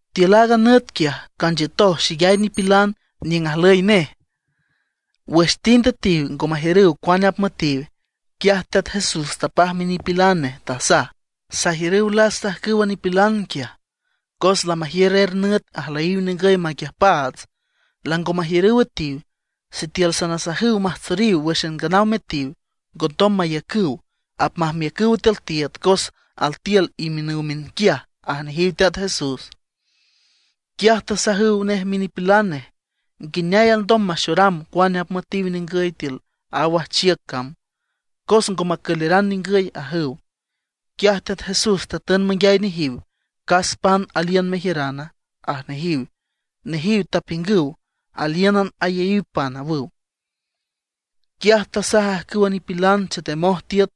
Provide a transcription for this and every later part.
Tiül aaga nüt quiaj, canchiütoj xeyay nipilan niüng ajlüy nej. Wüx tind üetiw ngo majiürüw cuane apmüetiw. Quiaj Teat Jesús tapaj minipilan nej, tasaj: ―Sajiürüw lasta ajcüwa nipilan quiaj, cos lamajiür er nüt ajlüyiw ningüy maquiüjpaats, lango majiürüw üetiw. Sitiül sanasajüw majtsoriw wǘxan nganaw metiw, ngondom maiücüw, apmajmiücüw tiül tiiüd cos altiül imiünüw miünquiaj ―aj nejiw Teat Jesús. Quiaj tasajüw nej minipilan nej: ―¿Nguineay alndom maxoram cuane apmüetiw ningüy tiül a wajchiüc cam? Cos ngo macüleran ningüy ―ajüw. Quiaj Teat Jesús tatün manguiay nejiw: ―¿Cas pan aliün mejiürana? ―aj nejiw. Nejiw tapiüngüw: ―Alíünan ayaíw pan ―awüw. Quiaj tasaj ajcüwa nipilan chetemoj tiüt,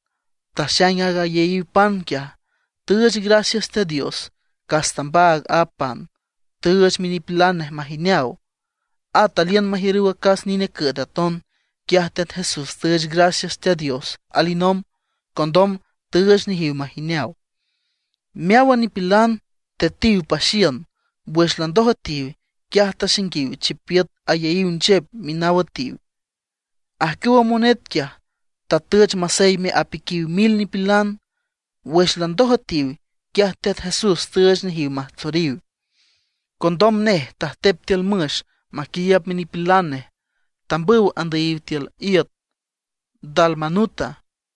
taxaing aaga ayaíw pan quiaj. Tüüch gracias Teat Dios, cas tambaag a pan, tüüch minipilan nej majineaw. At aliün majiürüw acas nine cüet aton. Quiaj Teat Jesús tüüch gracias Teat Dios alinomb. Condom tüüch nejiw majineaw. Meáwan nipilan tetiw paxiün. Wüx landoj üetiw, quiaj taxainguiw chipiüt ayaíw nchep minaw üetiw. Ajcüwa monet quiaj tatüch maseyme apiquiw mil nipilan. Wüx landoj üetiw, quiaj Teat Jesús tüüch nejiw majtsoriw. Condom nej tajtep tiül müx maquiiüb minipilan nej. Tambüw andüyiw tiül iüt Dalmanuta.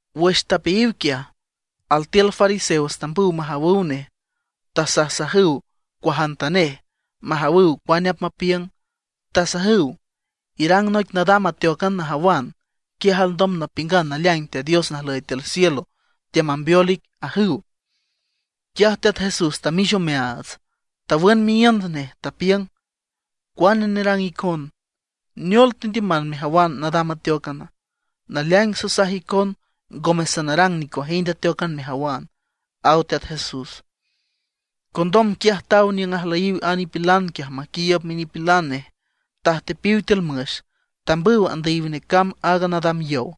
Wüx tapeayiw quiaj, altiül fariseos tambüw majawüw nej, tasajsajüw cuajantanej, majawüw cuane apmapiüng. Tasajüw: ―Irang noic nadam ateócan najawan, quiaj alndom napiüngan naleaing Teat Dios najlüy tiül cielo teamambeol ic ―ajüw. Quiaj Teat Jesús tamix omeaats, tawün miíünd nej, tapiüng: ―¿Cuane nerang icon? ¿Neol tendiüman mejawan nadam ateócan? Naleaing sasaj icon ngome sanarang nicuajind ateócan mejawan ―aw Teat Jesús. Condom quiaj taw niüng ajlüyiw a nipilan quiaj maquiiüb minipilan nej, tajtepiw tiül müx, tambüw tandüyiw necamb a nadam yow.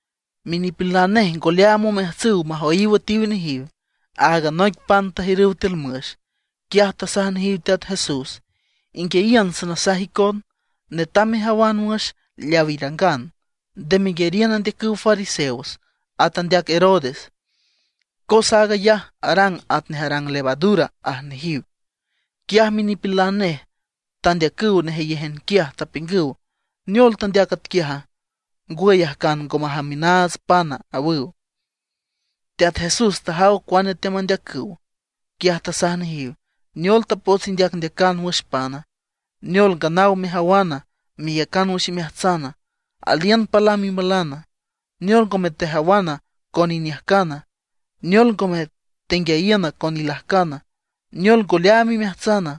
Minipilan nej ngo leaam omeajtsüw majoyiw üetiw nejiw, áagan noic pan tajiürüw tiül müx. Quiaj tasaj nejiw Teat Jesús: ―Inguiayiün sanasaj icon. Netam mejawan wüx leaw irangan. Nde meyariün andeacüw Fariseos, at andeac Herodes. Cos aag ayaj arang atnej arang levadura ―aj nejiw. Quiaj minipilan nej tandeacüw nejeyéjan quiaj, tapiüngüw: ―¿Neol tandeac atquiaja? ¿Ngwüy ajcan ngo majamiünaats pana? ―awüw. Teat Jesús tajaw cuane teamandeacüw. Quiaj tasaj nejiw: ―¿Neol tapots indeacndeacan wüx pana? ¿Neol nganaw mejawana, meyacan wüx imeajtsana? ¿Aliün palam imalana? ¿Neol ngome tejawan con iniüjcan? ¿Neol ngome tenguiayiün con ilajcan? ¿Neol ngo leaam imeajtsan?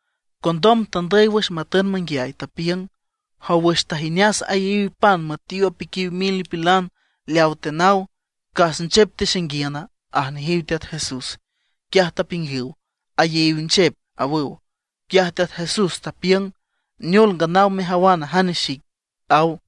Condom tandüy wüx matün manguiay, tapiüng: ―Jow wüx tajineas ayaíw pan müetiw apiquiw mil nipilan, leawa tenaw, ¿cas nchep texainguiüna? ―aj nejiw Teat Jesús. Quiaj tapiüngüw: ―Ayaíw nchep ―awüw. Quiaj Teat Jesús tapiüng: ―¿Neol nganaw mejawana jane xic? ―aw.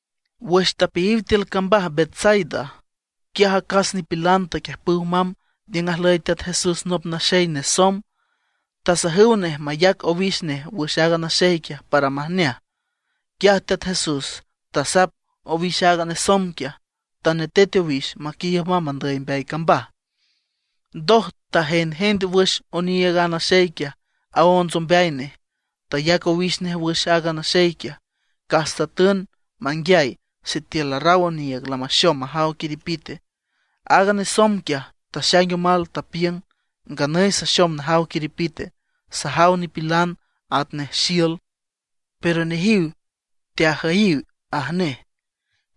Wüx tapeayiw tiül cambaj Betsaida, quiaj acas nipilan taquiüjpüw mamb niüng ajlüy Teat Jesús nop naxey nesomb. Tasajüw nej mayac owix nej wüx a naxey quiaj para majneaj. Quiaj Teat Jesús tasap owix a nesomb quiaj, tanetet owix maquiiüb mamb andüy mbeay cambaj. Ndoj tajendjend wüx oniiüg a naxey quiaj aonts ombeay nej, tayac owix nej wüx a naxey quiaj. Cas tatün manguiay sitiül larraw oniiüg lamaxom majaw quiripite. Aaga nesomb quiaj taxaing omal, tapiüng: ―Nganüy saxom najaw quiripite, sajaw nipilan atnej xiül, pero nejiw teajüyiw ―aj nej.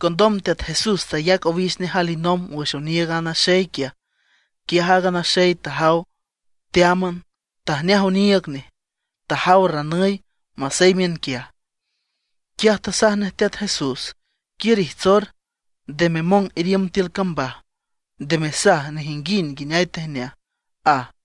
Condom Teat Jesús tayac owix nej alinomb wüx oniiüg a naxey quiaj. Quiaj aaga naxey tajaw teáman, tajneaj oniiüg nej, tajaw ranüy masey miünquiaj. Quiaj tasaj nej Teat Jesús: ―Quiür ijtsor, nde memong iriümb tiül cambaj, nde mesaj nejinguind nguineay tejneaj ―aj.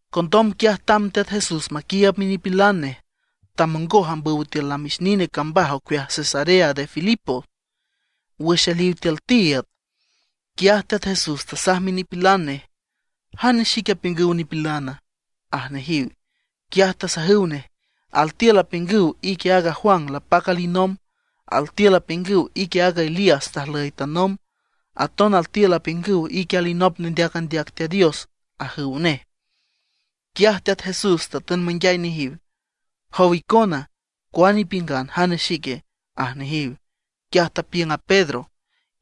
Condom quiaj tamb Teat Jesús maquiiüb minipilan nej, tamongoj ambüw tiül namix nine cambaj ocueaj Cesarea de Filipo. Wüx aliw tiül tiiüd, quiaj Teat Jesús tasaj minipilan nej: ―¿Jane xic apiüngüw nipilana? ―aj nejiw. Quiaj tasajüw nej: ―Altiül apiüngüw ique aaga Juan lapac alinomb. Altiül apiüngüw ique aaga Elías tajlüy tanomb. Aton altiül apiüngüw ique alinop nendeac andeac Teat Dios ―ajüw nej. Quiaj Teat Jesús tatün manguiay nejiw: ―Jow icona, ¿cuane ipiüngan, jane xic? ―aj nejiw. Quiaj tapiüng a Pedro: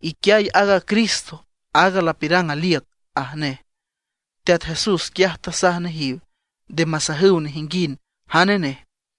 ―Iquiay aaga Cristo, aaga lapiürang aliüc ―aj nej. Teat Jesús quiaj tasaj nejiw nde masajüw nejinguind jane nej.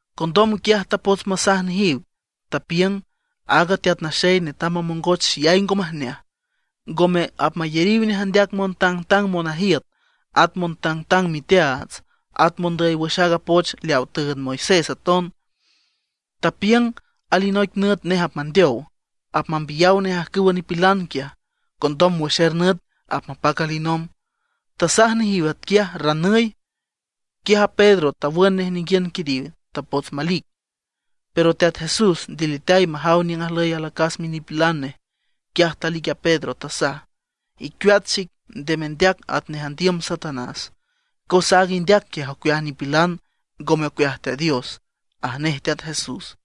Condom quiaj tapots masaj nejiw, tapiüng aaga Teat Naxey netam mamongoch xeyay ngo majneaj. Ngome apmayariw nej andeac montangtang monajiüt, at montangtang miteaats, at mondüy wüx aaga poch leaw tüünd a Moisés aton. Tapiüng alinoic nüt nej apmandeow, apmambiyaw nej ajcüwa nipilan quiaj. Condom wüx er nüt apmapac alinomb. Tasaj nejiw atquiaj ranüy. Quiaj a Pedro tawün nej ninguiün quiriw, tapots malic. Pero Teat Jesús ndiliteay majaw niüng ajlüy alacas minipilan nej, quiaj talic a Pedro, tasaj: ―¡Icueat xic, nde mendeac atnej andiüm Satanás! Cos aaga indeac quiaj ocueaj nipilan, ngome ocueaj Teat Dios ―aj nej Teat Jesús.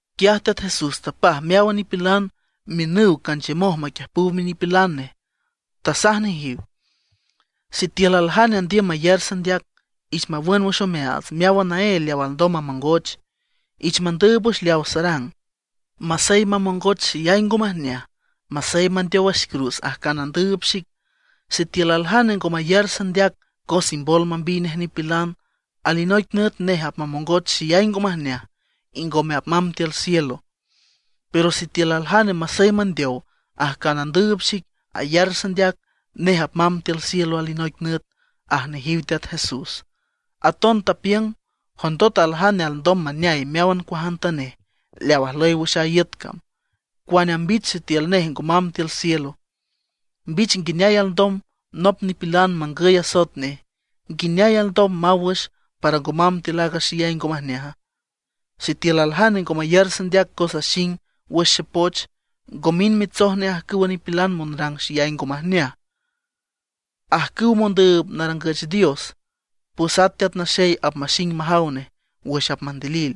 Quiaj Teat Jesús tapaj meáwan nipilan miünüw canchiümoj maquiüjpüw minipilan nej. Tasaj nejiw: ―Sitiül aljane andiüm mayar sandeac, ich mawün wüx omeaats meáwan naél leaw alndom mamongoch, ich mandüüb wüx leawa sarang, masey mamongoch xeyay ngo majneaj, masey mandeow wüx cruz ajcan andüüb xic. Sitiül aljane ngo mayar sandeac cos imbol mambiy nej nipilan, alinoic nüt nej apmamongoch xeyay ngo majneaj, y ngome apmamb tiül cielo. Pero sitiül aljane masey mandeow ajcan andüüb xic ayar sandeac, nej apmamb tiül cielo alinoic nüt ―aj nejiw Teat Jesús. Aton tapiüng: ―Jondot aljane alndom maneay meáwan cuajantanej leaw ajlüy wüx a iüt cam, ¿cuane ambich sitiül nej ngo mamb tiül cielo? ¿Mbich nguineay alndom nop nipilan mangüy asoet nej, nguineay alndom maw wüx para ngo mamb tiül aaga xeyay ngo majneaja? Sitiül aljane ngo mayar sandeac cos axing wüx xepoch, ngo mind mitsoj nej ajcüwa nipilan monrang xeyay ngo majneaj, ajcüw mondüüb narangüch dios, pues ata Teat Naxey apmaxing majaw nej wüx apmandilil.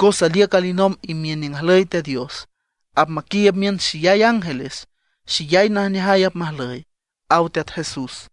Cos aliüc alinomb imiün niüng ajlüy Teat Dios. Apmaquiiüb miün xeyay ángeles, xeyay najneajay apmajlüy ―aw Teat Jesús.